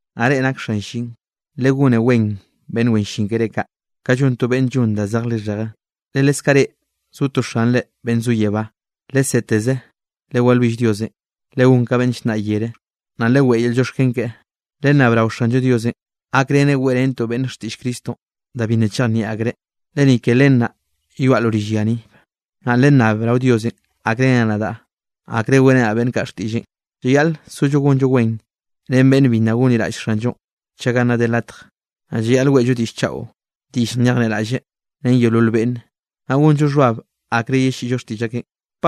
Naꞌ reꞌ nak xan llin, legone wen beꞌnn wen llin keré kaꞌ, ka llon to beꞌnn llon da zej lixheje, le leskaꞌ reꞌ zo to Xanre beꞌnn zo yebá. Leseteze lewalwill Diosenꞌ, legón ka beꞌnn llnnaꞌ yere, naꞌ leweꞌe yel llioxken keꞌe. Lennab rao Xanllo Diosenꞌ gakreneꞌ weꞌrentoꞌ beꞌnne xtiꞌll Cristonꞌ, da bi nna chejnieꞌ akreꞌ, le ni ke len naꞌ yoaꞌ lo rill ya ni. Naꞌ lennab rao Dios gakreneꞌ nadaꞌ akre weꞌrenaꞌ beꞌnn kaꞌ xtiꞌlleꞌn. Llayaꞌl sollo gonllo wen ren beꞌnn bi nna gonliraꞌll Xanllo, chaga nna de latje. Naꞌ llayaꞌl weꞌllo diꞌll chaꞌo diꞌll nyejnieꞌraꞌlle ren yeolol beꞌnne, naꞌ gonllo xhbab akre yelliꞌllo xtiꞌll akeꞌn.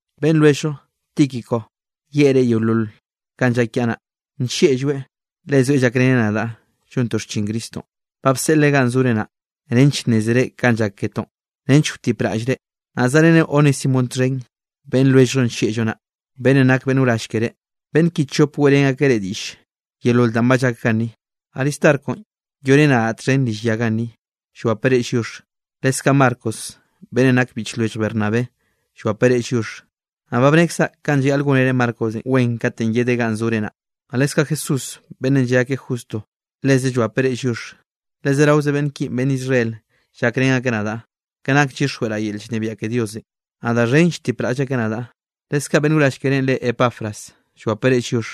Beꞌnn lwelljllo Tíquico yeꞌe reꞌ yeolol kanꞌ llak kiaꞌ naꞌ. Nllieꞌlloeꞌ le zoeꞌ llakreneꞌ nadaꞌ llontoꞌ xchin Cristonꞌ. Ba bseꞌleꞌ ganꞌ zore naꞌ, nench nnézere kanꞌ llak ketoꞌn nench wtipraꞌlleꞌ reꞌ. Naꞌ zaꞌreneꞌ Onésimonꞌ txhen beꞌnn lwelljllo nllieꞌllo naꞌ, beꞌnnenꞌ nak beꞌnn wrall keré. Beꞌnn ki chop weꞌrén akeꞌ reꞌ diꞌll yeolol danꞌ ba llak ganni. Aristarconꞌ yoꞌreneꞌ nadaꞌ txhen rill yanꞌ ganni, llwapeꞌ reꞌ lliox. Leskaꞌ Marcos beꞌnnenꞌ nake biꞌch lwellj Bernabé llwapeꞌ reꞌ lliox. Naꞌ ba bnekzaꞌ kanꞌ llayaꞌl gónere Marcosenꞌ wen katenꞌ yedeꞌ ganꞌ sore naꞌ. Naꞌ leskaꞌ Jesús beꞌnnenꞌ lle akeꞌ Justo, leze llwapeꞌ reꞌ lliox. Le zeraoze beꞌnn ki beꞌnn Israel llakrén akeꞌ nadaꞌ, ke nak llyixjweꞌraꞌ yel llnebiaꞌ ke Diosenꞌ. Naꞌ da xhen lltipraꞌll akeꞌ nadaꞌ. Leskaꞌ beꞌnn wrall kerénꞌ re Epafras llwape reꞌ lliox.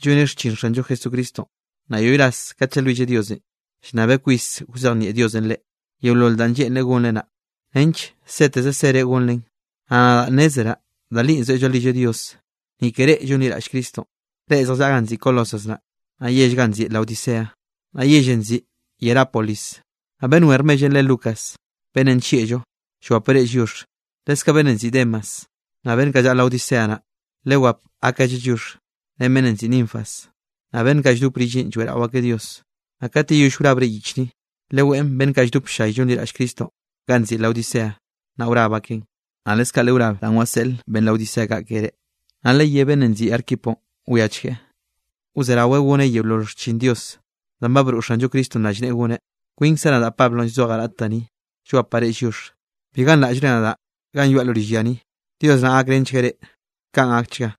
Lloneꞌ xchin Xanllo Jesucristonꞌ, naꞌ yoꞌy ras kat llalwilleꞌ Diosenꞌ, llnnabeꞌ kwis wzejnieꞌ Diosenꞌ reꞌ, yeolol danꞌ lleꞌnreꞌ gonre naꞌ, nench seteze sere gonren. Naꞌ nadaꞌ nnezeraꞌ da li zoeꞌ llalwilleꞌ Dios, ni ke reꞌ llonliraꞌll Cristonꞌ, reꞌ zjallaꞌa ganꞌ nziꞌi Colosas naꞌ, naꞌ yell ganꞌ nziꞌi Laodicea, naꞌ yellenꞌ nziꞌi Hierápolis. Naꞌ beꞌnn wen rmellenꞌ re Lucas, beꞌnnenꞌ nllieꞌllo, llwapeꞌ reꞌ lliox, leskaꞌ beꞌnnenꞌ nziꞌi Demas. Naꞌ beꞌnn kaꞌ llaꞌa Laodicea naꞌ, lewap akgalleꞌ lliox, ren beꞌnnenꞌ nziꞌi Ninfas, naꞌ beꞌnn kaꞌ lldop rilleꞌn lloeꞌrao akeꞌ Dios. Naꞌ kat yeyoll wrabre yich ni, leweꞌn beꞌnn kaꞌ lldop ll-llay llonliraꞌll Cristonꞌ ganꞌ nziꞌi Laodicea, naꞌ wrab akeꞌn. Naꞌ leskaꞌ lewrab danꞌ waseꞌl beꞌnn Laodicea kaꞌ keré. Naꞌ leyé beꞌnnenꞌ nziꞌi Arquiponꞌ, wiachgueꞌ wzeraweꞌ goneꞌ yeolol xchin Dios danꞌ broꞌ Xanllo Cristonꞌ rallneꞌe goneꞌ. Kwinkzaꞌ nadaꞌ Pablo llzojaꞌ raꞌt da ni, llwapaꞌ reꞌ lliox. Bi ganraꞌllre nadaꞌ ganꞌ yoaꞌ lo rill ya ni. Dios naꞌ gakrenchgueꞌ reꞌ. Kaꞌn gakchga.